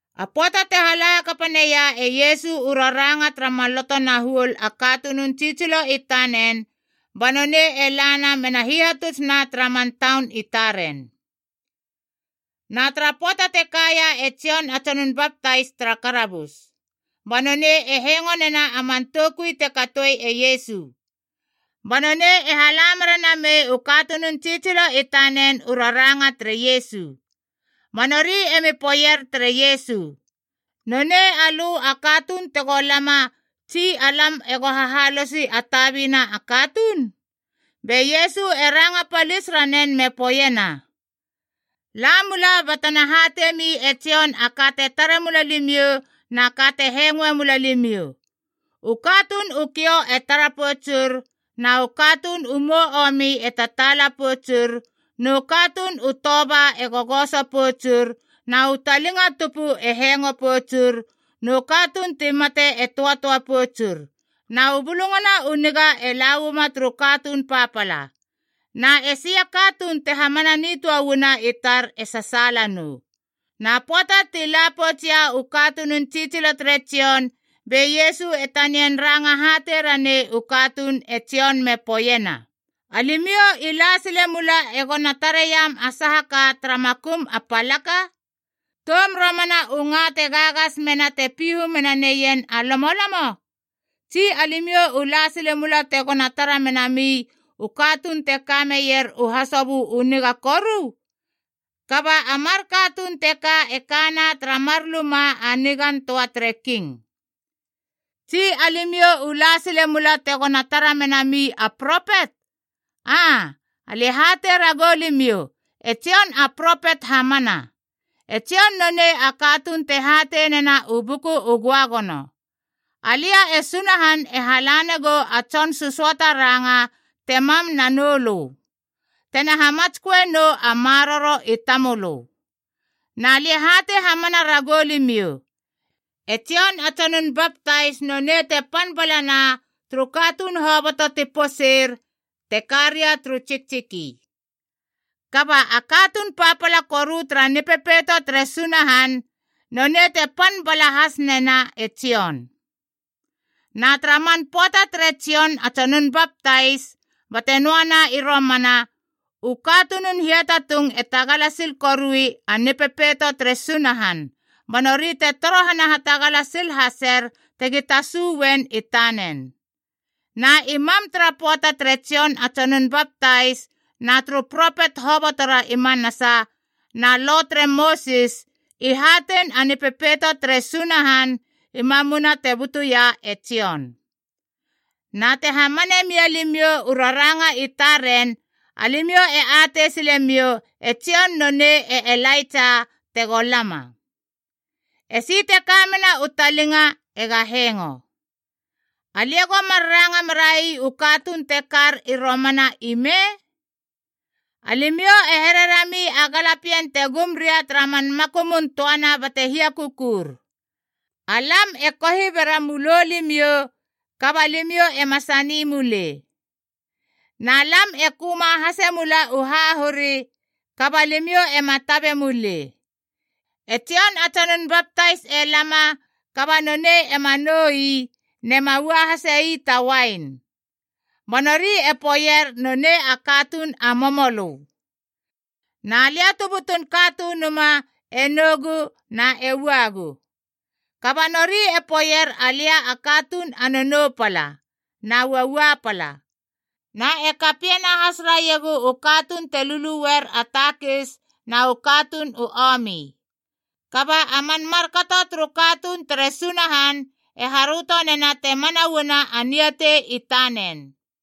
A pöata te hala hakapa neia e Iesu u raranga tara maloto na huol a katunun tsitsilo i tanen, ba nonei e lana mena hihatutsna tara man taun i taren. Na tara pöata te kaia e Jon a Tsonun Baptais tara karabus. Ba nonei e hengo nena a man toukui te katoe e Iesu. Ba nonei e hala mera namei u katunun tsitsilo i tanen u raranga tere Iesu. Ba nori emi poeier tere Iesu, “Nonei alö a katuun tego lama, tsi alam ego hahalosi a tabina katuun?” Be Iesu e ranga palis ranen me poeiena, “La mula batena hateimi e Jon a ka te tare mula limiou na ka te hengoe mula limiou. U katuun u kiou e tara poutsur, na u katuun u mou omi e tataala poutsur, nu katuun u toba e gogoso poutsur, na u talinga tupu e hengo poutsur, nu katuun ti mate e töatöa poutsur. Na u Bulungana u Niga e lauama turu katuun papala. Na esi a katuun te hamana nitöa uana i tar e sasaala nou!” Na pöata ti la poutsia u katunun tsitsilo tere Jon, be Iesu e tanian ranga hatei ranei u katuun e Jon me poeiena, “Alimiou i la sile mula egona tareiam a saha ka tara makum a palaka? Toum romana u nga te gagas mena te pihu mena neien a lomolomo? Tsi alimiou u la sile mula tegona tara menami u katuun te ka meier u hasobö u niga koru? Kaba a mar katuun teka e kana tara mar luma a nigan töa tere king. Tsi alimiou u la sile mula tegona tara menami a propet? Aa, alia e hatei ragou limiou e Jon a propet hamana. E Jon nonei a katuun te hatei nena u Buku u Göagono, ‘Alia e Sunahan e halana gou a tson sösöata ranga te mam nanoulö, tena hamatsköenou a maroro i tamölö.’ “Na lia e hatei hamana ragou limiou, e Jon a Tsonun Baptais nonei te pan balana turu katuun hoboto ti poseir te ka ria turu tsiktsiki. Kaba a katuun papala koru tara Nipepeito tere Sunahan nonei te pan bala has nena e Jon. Na tara man pöata tere Jon a Tsonun Baptais bate noana i romana, u katunun hiatatung i tagala sil korui a Nipepeito tere Sunahan, ba nori e torohana hatagala sil haser tegi tasu uen i tanen. Na i mam tara pöata tere Jon a Tsonun Baptais, na turu propet hobotora i manasa, na lo tere Mosis, i hatein a Nipepeito tere Sunahan i mamuna te butuia e Jon. Na te hamane mia limiou u raranga i taren, alimiou e atei silemiou e Jon nonei e Elaitsa tego lama. Esi te kamena u talinga ega hengo! “Alia go mar ranga merai u katuun te kar i romana ime? Alimiou e hererami a galapien te gum ria tara man makumun töana bate hia kukur, ‘Alam e kohi bera mulo limiou kaba limiou ema sani mulei! Na lam e köma hase mula u hahuri, kaba limiou ema tabe mulei!’ E Jon a Tsonun Baptais e lama kaba nonei ema nou ii nema ua hase ii ta uain. Ba nori e poeier nonei a katuun a momolö. Na lia tu butun Katunuma e nougu na e uagu. Kaba nori e poeier alia a katuun a nounou pala, na uaua pala. Na e kapiena has raiegu u katuun te lulueier a takis na u katuun u omi. Kaba a man markato turu katuun tere Sunahan e haröto nena te mana uana a niatei i tanen.”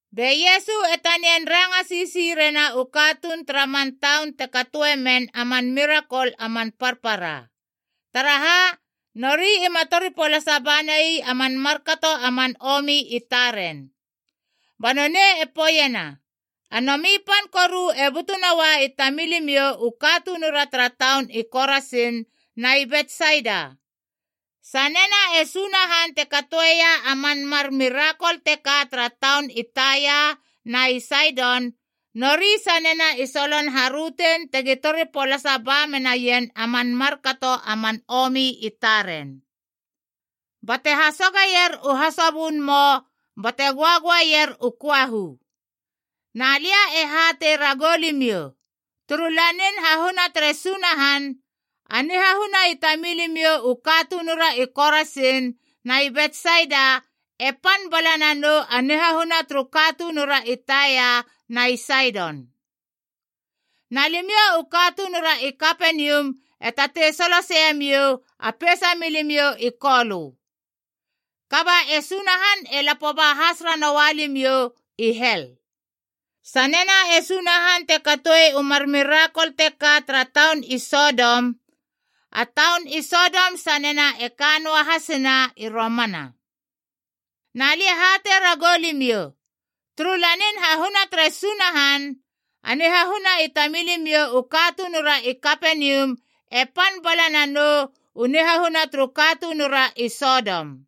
Be Iesu e tanian ranga sisi rena u katuun tara man taun te katoe men a man mirakol a man parpara. Taraha, nori ima tori polasa banai a man markato a man omi i taren. Ba nonei e poeiena, “A nomi pan koru e butu noua i tamilimiou u katunura tara taun i Korasin na i Betsaida! Sanena e Sunahan te katoeia a man mar mirakol teka tara taun i Taia na i Saidon, nori sanena i solon harötein tegi tori polasa ba menaien a man markato a man omi i taren, bate hasoger u hasobön mou bate göagöaeier u köahu. Na lia e hatei ragou limiou, turu lanin hahuna tere Sunahan, a nihahuna i tamilimiou u katunura i Korasin na i Betsaida e pan bala nanou a nihahuna turu katunura i Taia na i Saidon. Na limiou u katunura i Kapenium e tatei soloseiemiou a peisa milimiou i kolö, kaba e Sunahan e lapo ba has ranoua limiou i hel! Sanena e Sunahan te katoe u mar mirakol teka tara taun i Sodom, a taun i Sodom sanena e ka noa hasina i romana. Na lia e hatei ragou limiou, turu lanin hahuna tere Sunahan, a nihahuna i tamilimiou u katunura i Kapenium e pan bala nanou u nihahuna turu katunura i Sodom.”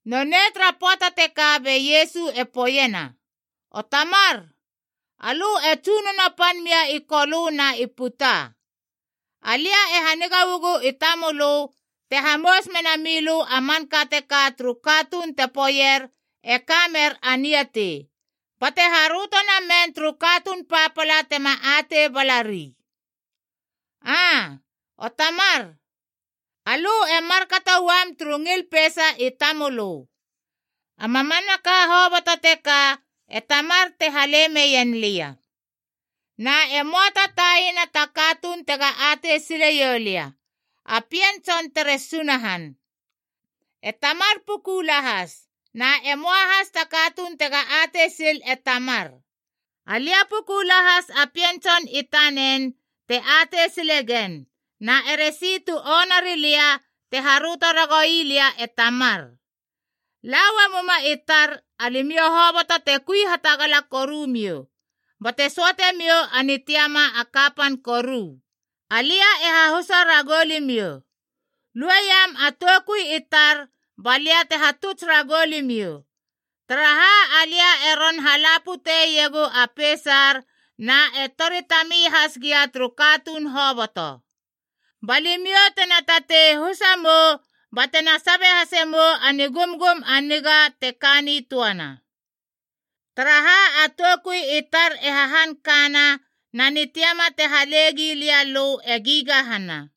Nonei tara pöata teka be Iesu e poeiena, “O Tamar, alö e Tsunono pan mia i Kolö na i puta. Alia e haniga uagu i tamölö te hamous mena milö a manka teka turu katuun te poeier e ka mer a niatei, bate haröto namen turu katuun papala tema atei balari. Aa, O Tamar, alö e markato uam turu ngil peisa i tamölö. “A mamanaka hoboto teka e Tamar te hale meien lia. Na e möa ta taina ta katuun tega atei sileiou lia, a Pien Tson tere Sunahan. E Tamar puku lahas. Na e möa has ta katuun tega atei sil e Tamar. Alia puku lahas a Pien Tson i tanen te atei silegen, na eresi tu onarilia te haröto ragoui lia e Tamar. “La uamuma i tar, alimiou hoboto te kui hatagala koru miou, bate söate miou a nitiama a kapan koru. Alia e hahusa ragou limiou. Lueiam a toukui i tar balia te hatuts ragou limiou, taraha alia e ron hala puteiegu a peisar na e tori tami has gia turu katuun hoboto. Ba limiou tena tatei husa mou batena sabe hase mou a nigumgum a niga te ka nitöana. Taraha a toukui i tar e hahan kana, na nitiama te hale gilia lö e gigahana.”